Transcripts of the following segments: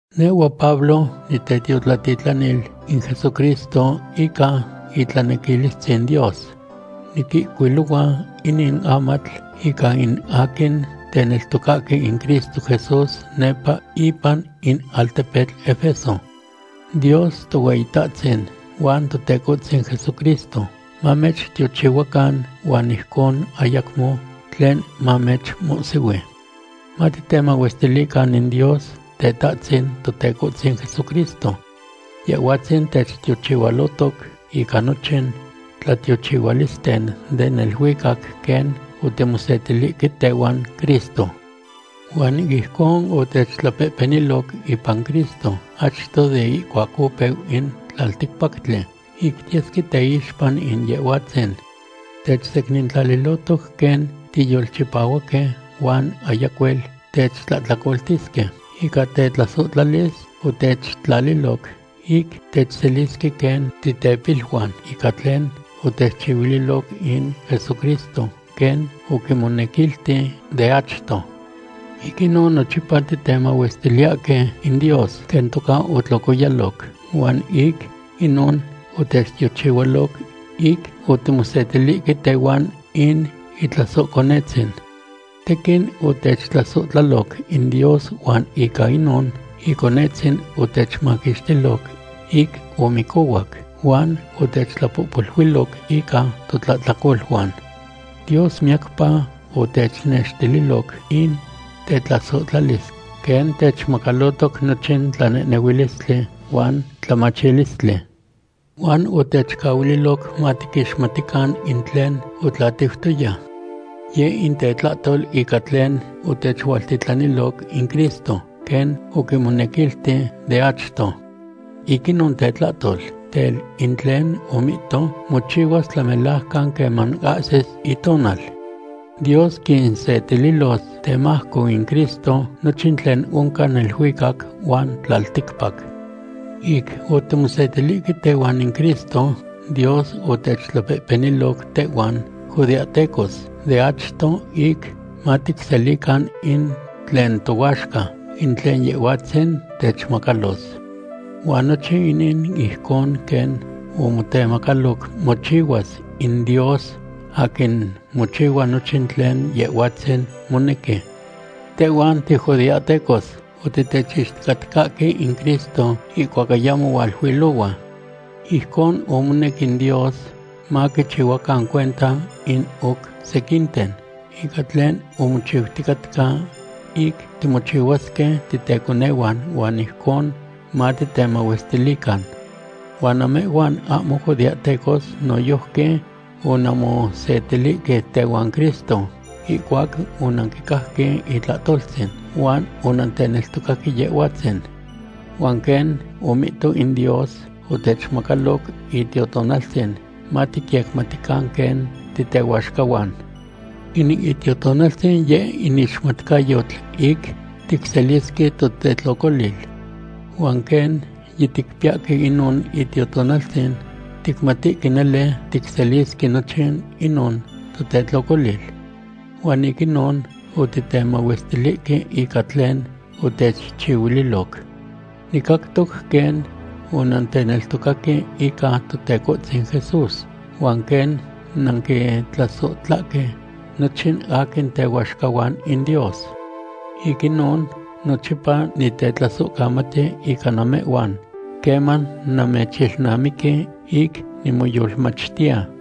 Nehhua Pablo nitetiotlatitlanil in Jesucristo ica itlanequilistzin Dios. Niquihcuilohua inin amatl ica in aquin teneltocahque in Cristo Jesús nepa ipan in altepetl Efeso. Dios Tohueyitahtzin huan Totecohtzin Jesucristo mamechtiochihuacan huan ijcon ayacmo tlen mamechmohsihui. Matitemahuestilican in Dios Tetahtzin Totecohtzin Jesucristo. Yehhuatzin techtiochihualotoc ica nochin tlatiochihualisten den neluicac quen otimosetilihque tehuan Cristo. Huan ijcon otechtlapehpeniloc ipan Cristo achto de ihcuac opeu in tlalticpactli, ic tiyesque teixpa in Yehhuatzin. Techsecnintlalilohtoc quen tiyolchipahuaque huan ayacuel techtlahtlacoltisque. Ica tetlasohtlalis otechtlaliloc ic techselisque quen titepiluan ica tlen otechchihuililoc in Jesucristo, quen oquimonequilti de achto. Ic inon nochipa titemahuestiliyahque in Dios quen toca otlocoyaloc huan ic inon otechtiochihualoc ic otimosetilihque tehuan in Itlasohconetzin. Tequin otechtlasohtlaloc in Dios huan ica inon Iconetzin otechmaquixtiloc ic omicohuac, huan otechtlapohpoluiloc ica totlahtlacoluan. Dios miyacpa otechnextililoc in tetlasohtlalis, quen techmacalotoc nochin tlanehnehuilistli huan tlamachilistli. Huan otechcahuililoc matiquixmatican in tlen otlatiutoya. Yeh in tetlahtol ica tlen otechualtitlaniloc in Cristo, quen oquimonequilti de achto. Ic inon tetlahtol, tel, in tlen omihto mochihuas tlamelajcan queman ahsis itonal. Dios quinsetililos temajco in Cristo nochin tlen oncan neluicac huan tlalticpac. Ic otimosetilihque tehuan in Cristo, Dios otechtlapehpeniloc tehhuan judeahtecos de achto ic maticselican in tlen tohuaxca, in tlen Yehhuatzin techmacalos. Huan nochin inin ijcon quen omotemacaloc mochihuas in Dios, aquin mochihua nochin tlen Yehhuatzin monequi. Tehhuan tijudeahtecos otitechixticatcahque in Cristo ihcuac ayamo hualuilohua. Ijcon omonec in Dios maquichihuacan cuenta in oc sequinten ica tlen omochiuticatca ic timochihuasque titeconehuan huan ijcon matitemahuestilican. Huan namehhuan ahmo judeahtecos noyojqui onanmosetilihque tehuan Cristo ihcuac onanquicajque itlahtoltzin, huan onanteneltocaque Yehhuatzin. Huan quen omihto in Dios, otechmacaloc Itiotonaltzin maticyecmatican quen titehuaxcahuan. In Itiotonaltzin yeh in ixmatcayotl ic ticselisque totetlocolil. Huan quen yiticpiyahque inon Itiotonaltzin, ticmatihque nele ticselisque nochin inon totetlocolil. Huan ic inon otitemahuestilihque ica tlen otechchihuiloc. Nicactoc quen onanteneltocaque ican Totecohtzin Jesús huan quen nanquintlasohtlahque nochin aquin tehuaxcahuan in Dios. Ic inon nochipa nitetlasohcamati ica namehhuan queman namechilnamiqui ic nimoyolmachtiya.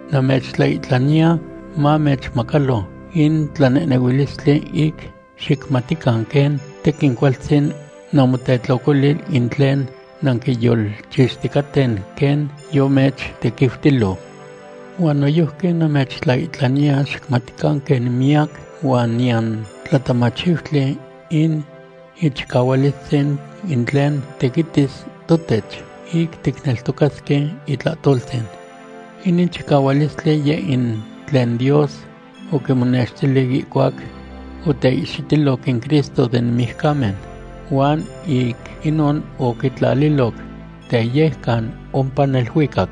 Namechtlaihtlaniya mamechmacalo in tlanehnehuilistli ic xicmatican quen tequin cualtzin namotetlocolil in tlen nanquiyolchixticaten quen yomechtequiutilo. Huan noyojqui namechtlaihtlaniya xicmatican quen miyac huan niyan tlatamachiutli in ichicahualistzin in tlen tequitis totech ic ticneltocasque itlahtoltzin. Inin chicahualistli, yeh in tlen Dios oquimonextili ihcuac oteihxitiloc in Cristo den mijcamen huan ic inon oquitlaliloc teyejcan ompa neluicac.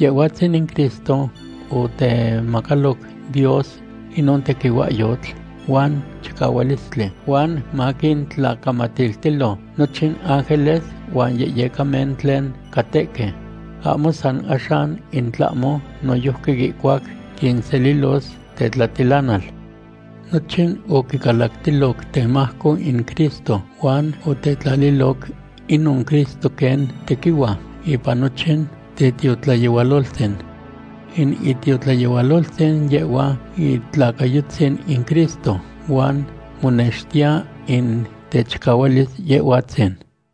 Yehhuatzin in Cristo otemacaloc Dios inon tequihuahyotl huan chicahualistli huan maquintlacamatiltilo nochin ángeles huan yehyecamen tlen catehque, ahmo san axan in tlahmo noyojqui ihcuac quinselilos tetlatilanal. Nochin oquicalactiloc temajco in Cristo huan otetlaliloc inon Cristo quen tequihua ipan nochin tetiotlayehualoltzin. In itiotlayehualoltzin, yehhua itlacayotzin in Cristo huan monextiya in techicahualis Yehhuatzin.